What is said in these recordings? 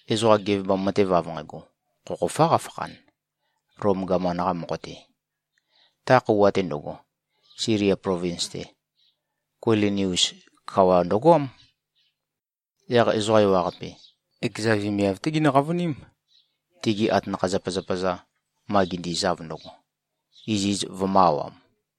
Ezoqa gevebam matev av nqægo, khokhofá qafakhan, Lom gaman-qa mokho-te. Ta khøuwa-te ndøgo, Silia plovins-te, Kuilinius kawa ndøgoám. Yaq ezoqa ewaqape, ekeza vemiav-té ginø-qavøním, tigi atanakha-zapazapa-za ma gindizav ndøgo, iziz vømø̄-awam.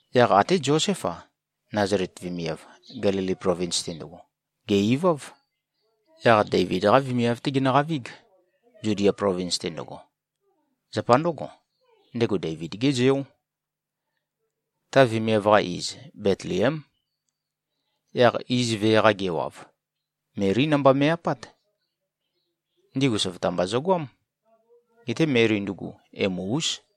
Yaq até Zoséf-a, Nazalet vemiav, Gelili plovins-te ndøgo, gè-iváv. Yaq Deivid-qá vemiav-té genøqavíg, Zudia plovins-te ndøgo. Zapa ndǿgo, ndego Deivid-gé zeó. Ta vemiav-qa iz Betliém. Yaq iz vee-qa gewav, Melí namba me꞉-apát. Ndigu søvøta mba zøgoám. Geté Meli ndugu, emu-ús.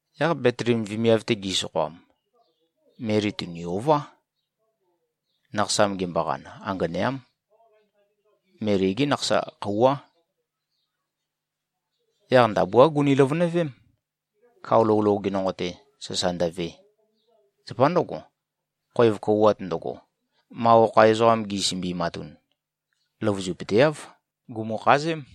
Yaq Betliem vemiav-te gi꞉sokhoam, Meli tùni-ová. Nakhasam gemboqan, anganeám. Meli-gé nakhasa khøuwá. Yaq ndabuá guni-løvønøvém, kao lou loge nonqo-te sasa ndøve. Zapa ndǿgo, khoev kouwat ndøgo, ma okha ezoqam gisømbi꞉matun, løvøzupøteáv. Gùmukhazém.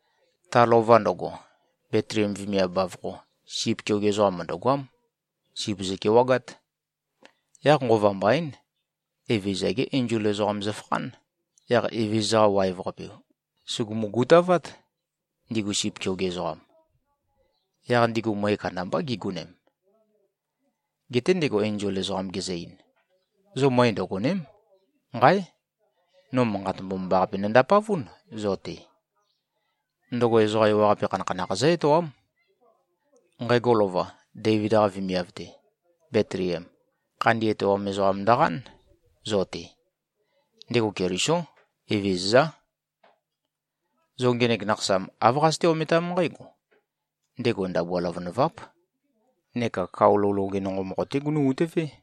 Ta lova ndøgo, Betliem vemiav bavokho, sip keoge ezoqam mø̀ndøgoám. Sip zøkewagát. Yaq nqova mbaín, Evezøza-gé enzol ezoqam zøfakhán. Yaq Evezøza-qa waev-qape, sùgumu-gutavát, ndigu sip keoge ezoqam. Yaq ndigu møe kandambá gigonem. Geté ndego enzol ezoqam gezø-ein, “Zo møe ndøgòne᷄m. Nqáe! No manqat mbomambaqape nondapavún zo-te. Ndøgo ezoqa ewaqape khanakhanakh zǿ-etoám. Nqægo lova, Deivid-qa vemiav-te, Betliem, khandi etoam ezoqam ndøqán, zo-te. Ndego Kelisó. Evezøzá. Zo ngenek nakhasam, āv qazøté-ometám nqǽgo: Ndego ndabua løvønøváp, neka kao lou loge nonqo mokho-té gunu꞉-utøvé.”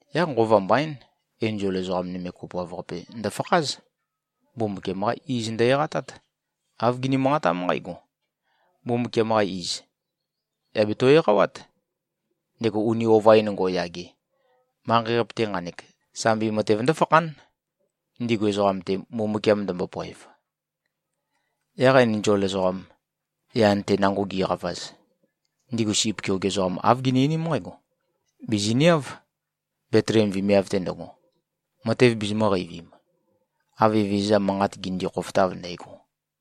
Yaq nqova mbaín, enzol ezoqa nøme kopoav-qape ndøfakház. Mbumbukiam-qá iz ndø-eqatát. Āv gini-manqatám nqǽgo, “Mbumbukiam-qa iz yà beto-eqawát, ndego uni ova-in ngo꞉yage. Manqei-qape-te nqanek, sambi matev ndǿfakhán, ndigu ezoqam-te, Mbumbukiam ndømbopoev.” Yaq enzol ezoqam, yan-te nango giqavaz, ndigu sip keoge ezoqam āv gini-einím nqǽgo, “Bìziniáv, Betliem vemiav-te ndøgo, matev bizimø̄-qeivim, av Evezøza manqat ginindi-khofotav ndægo.”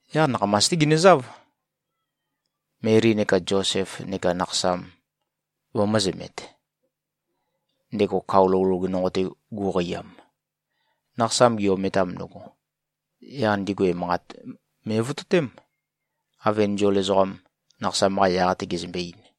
Yaq nakhamas-té ginøzáv, Meli neka Zosef neka nakhasam vømø̄zømet, ndego kao lou loge nonqo-te gu꞉qeiam. Nakhasam gi-ometam ndøgo, yaq ndigu emanqat me꞉vototém, av enzol ezoqam, nakhasam-qa yaq-te gezømbe-ein.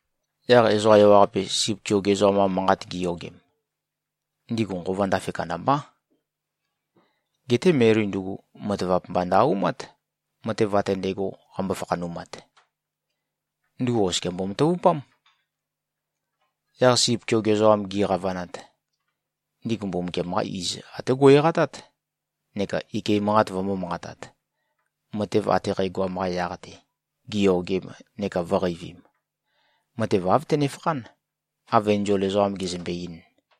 Yaq ezoqa ewaqape, sip keoge ezoqam-qa manqat giyogem, ndigu nqova ndafe kandambá. Geté Meli ndugu, matavap mba ndø-aumát, matev ate ndægo qambo-fakhanumat. Ndugu oskia mbomatavupám. Yaq sip keoge ezoqam giqavanat, ndigu Mbumbukiam-qa iz até go꞉-eqatát neka ike manqat vømbō-manqatat, matev ate qægoam-qa yaq-te, giyogem neka vø̄qeivim. Matev āv tønefakhán, av enzol ezoqam gezømbe-ein.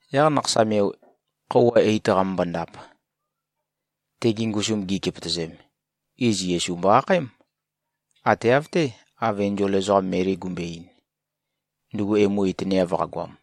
Yaq nakhasam-yo khøuwa eit qamømbo-ndap, tegi ngusum gi꞉kepøtøzem, iz Yesu mbo-akhaém, ate av-té, av enzol ezoqam Meli gumbøe-ein, ndugu emu itøneav qagoam.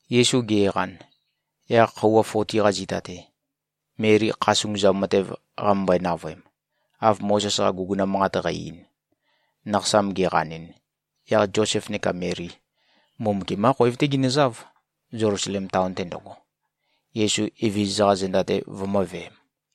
Yesu ge꞉qan, yaq khøuwa foti-qa zita-te, Meli kha sunguzam matev qamømbøe-navøem, av Mozes-qa guguna manqat qæ-ein, nakhasam ge꞉qanɨn, yaq Zosef neka Meli, Mbumbukiam-qá khoev-té ginøzáv, Zelusalem taon-te ndøgo, Yesu Evezøza-qa zenda-te vømǿveēm.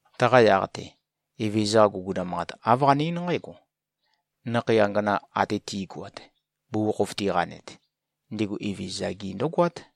Taqa yaq-te, Evezøza-qa guguna manqat, āv qane-eín nqǽgo, “Nakhei angana ate ti꞉goat, bugukhokhof tiqanet, ndigu Evezøza-gi ndǿgoát.”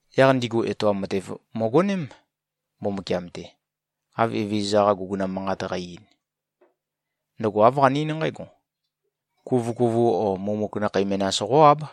Yaq ndigu etoam matev møgoném, Mbumbukiam-te, av Evezøza-qa guguna manqat qæ-ein. Ndøgo āv qane-eín nqǽgo: Kuvøkuvu o mumuk nakhei menas qó-áb.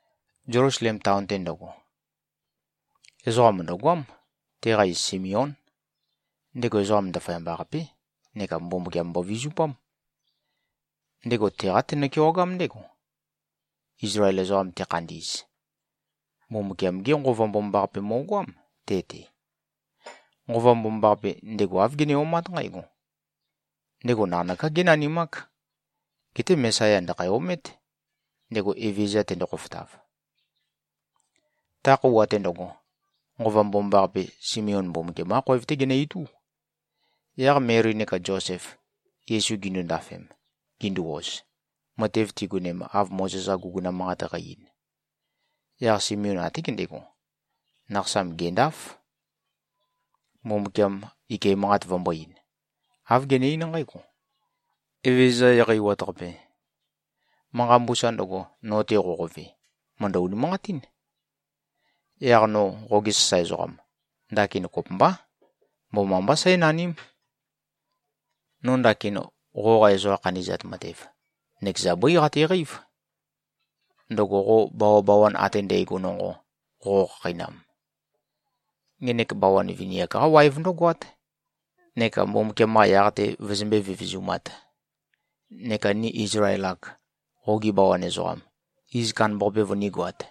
Zelusalem taon-te ndøgo, ezoqa mø̀ndøgoám. Teqa iz Simeón. Ndego ezoqam ndaføyamba-qapé neka Mbumbukiam mbovizupám. Ndego teqá tenø-kewagám ndégo, Izlael ezoqam tekhandi꞉z. Mbumbukiam-gé Nqova Mbomambaqape mo꞉goám, te-te. Nqova Mbomambaqape, ndego āv gene-omát nqǽgo: Ndego naqanøká génanimák. Geté Mesaya ndø̀khæ-omét, ndego Evezøza tendo-khofotav. Ta khøuwa-te ndøgo, Nqova Mbomambaqape, Simeon Mbumbukiam-qá khoev-té genø-itú. Yaq Meli neka Zosef, Yesu gindu-ndafem, gindu-oz, matev tigonem, av Mozes-qa guguna manqat qæ-ein, yaq Simeon até gendego, nakhasam gèndāf, Mbumbukiam ike manqat vømbō-ein. Āv gene-eín nqǽgo, “Evézøza Eqeiwat-Qape. Manqa mbusa ndøgo, no-te qoqove, mø̀ndø-unimanqatín. Yaq no, qoge sasae ezoqam, ndakin kopømbá, mbomambá sǽnaním. No ndakin qoqa ezoqa khandi꞉zat matev, nøkeza bøí qateqeív, ndøgo qo bawabawan ate ndægo nonqo qoqo-khakheinam. Ngenek bawan vini-ak-qá waev ndǿgoát, neka Mbumbukiam-qa yaq-te vøzømbé-vevezumāt, neka ni Izlael-ak, qogi bawan ezoqam, iz kandambaqape vønígoāt.”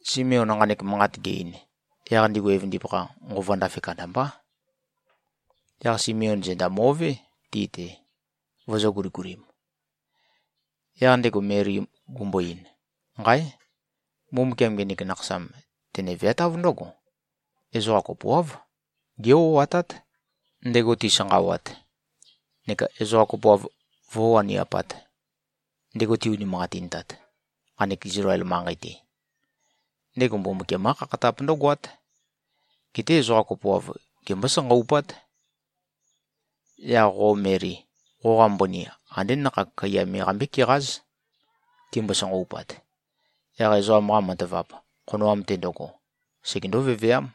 Simeon nqanek manqat ge-ein, yaq ndigu evøndipakha, nqova ndafe kandambá. Yaq Simeon zenda mo꞉vé ti-te, vøzø̄-guligulim. Yaq ndego Meli gumbo-ein, “Nqáe! Mbumbukiam ngenek nakhasam tene-veatáv ndǿgo: Ezoqa kopoáv gé-o꞉atát, ndego tisanqawat, neka ezoqa kopoav vǿwaniapāt, ndego ti-unimanqatintat, nqanek Izlael manqei-te. Ndego Mbumbukiam-qá khakhatap ndǿgoát. Geté ezoqa kopoav gembó-sanqaupát. Yaq, qo Meli, qoqa mbøni andé nakhag kaiya me qambé-keqáz. Timbo-sanqaupat, yaq ezoqam-qa matavap, khonoam-te ndøgo, segendó-veveám.”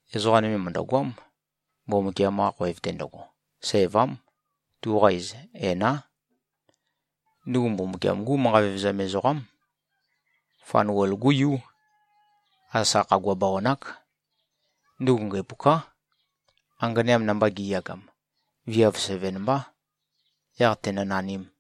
Ezoqa nøme mø̀ndøgoám, Mbumbukiam-qa khoev-te ndøgo. Sævám. Tuqa iz, Ená. Ndugu Mbumbukiam-gú manqa vevezam ezoqám. Fanuel-gú yú. Asa khagua bawan-ák. Ndugu ngæpuká. Anganeam namba gi꞉yagam, viav seven mbá, yaq tēnø̄-nānīm.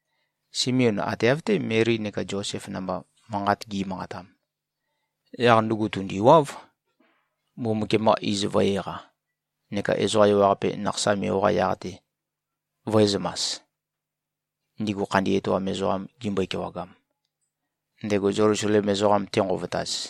Simeon ate av-té Meli neka Zosef namba manqat gi꞉manqatam, yaq ndugu tùndiwáv, Mbumbukiam-qa iz vø̄-eqa neka ezoqa ewaqape nakhasam-yo-qa yaq-te vø̄ezømas, ndigu khandi etoam ezoqam gimbøe-kewagam, ndego Zelusalem ezoqam tenqovotaz.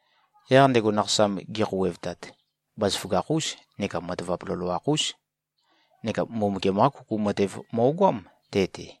Yaq ndego nakhasam gekhouwevtat, bazaføgakh-ús neka matavap loloakh-ús. Neka Mbumbukiam-qá kuku matev mo꞉goám te-te.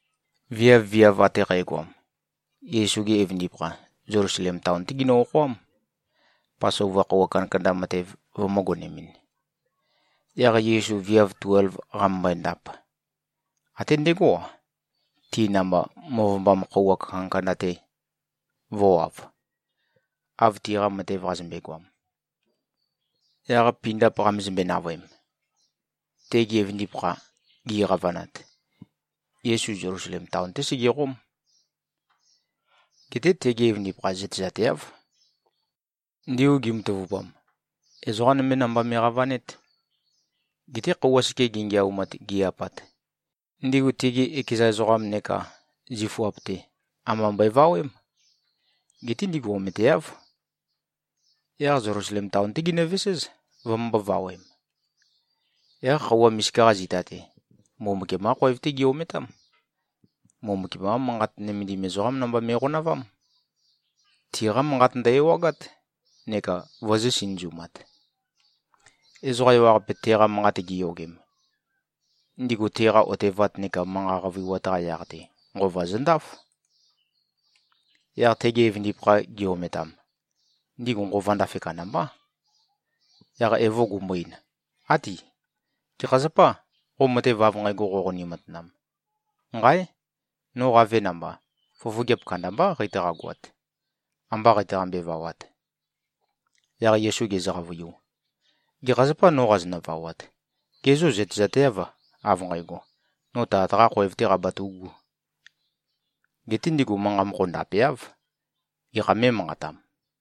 Viav-viav ate qægoam, Yesu-gi evøndipakha, Zelusalem taon-té ginø-okhoám, Pasova khøuwa kandakanda matev vømø̄-gonemɨn. Yaq Yesu viav tuelv qamømbøe-ndap, até ndegó-a, ti namba møvømbam khøuwa kandakanda-te vø̄wav, av tiqa matev qazømbe-goam. Yaq pindap qamezømbe-navøem, tegi evøndipakha gi꞉qavanat, Yesu Zelusalem taon-té segeqóm. Geté tegi evøndipakha zøtezateáv. Ndigu gimatavupam, ezoqá nømé namba me꞉qavanét. Geté khøuwa seke gingiaumat, gi꞉-apat, ndigu tigi ekeza ezoqam neka zifuap-te amba mbøevawém. Geté ndigu ometeáv. Yaq Zelusalem taon-té ginøveséz, vømømbō-vawem. Yaq khøuwa misika-qa zita-te, Mbumbukiam-qá khoev-té gi-ometám. Mbumbukiam-qá Manqat nømendim ezoqám namba me꞉qonavám. Tiqá manqat ndø-ewagát, neka vøzø̄-sinøzumat. Ezoqa ewaqape, teqa manqat giyogem, ndigu teqa otevat neka manqa qavøiwat-qa yaq-te, nqova zøndáf. Yaq tegi evøndipakha gi-ometam, ndigu nqova ndafe kandambá. Yaq evo gumbo-ein, “Áti. Gekha zapâ, qo matev av nqægo qoqoni-matanam? Nqáe! No qave namba, fofogeap kandambá qeitaqa-goat, amba qeitaqambe-vawat.” Yaq Yesu gezø-qavøiu, “Gekha zapâ, no qazonø-vawat? Gê, zo zøtezateâv, av nqægo, no Tat-qā khoev-tē qabatu꞉gū?” Geté ndigu manqa mokho ndapeáv, gekhā mé꞉manqatam.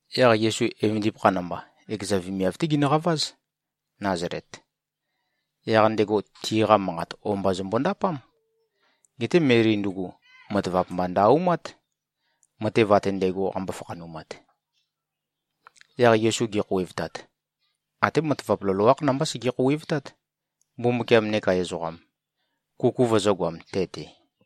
Yaq Yesu evøndipakha namba, ekeza vemiav-té ginøqaváz, Nazalet. Yaq ndego tiqa manqat o-mba zømbo-ndapám. Geté Meli ndugu, matavap mba ndø-aumát, matev ate ndægo, qambo-fakhanumat. Yaq Yesu gekhouwevtat, até matavap loloákh namba sege-khouwevtát, Mbumbukiam neka ezoqam, kuku vøzø̄goam te-te.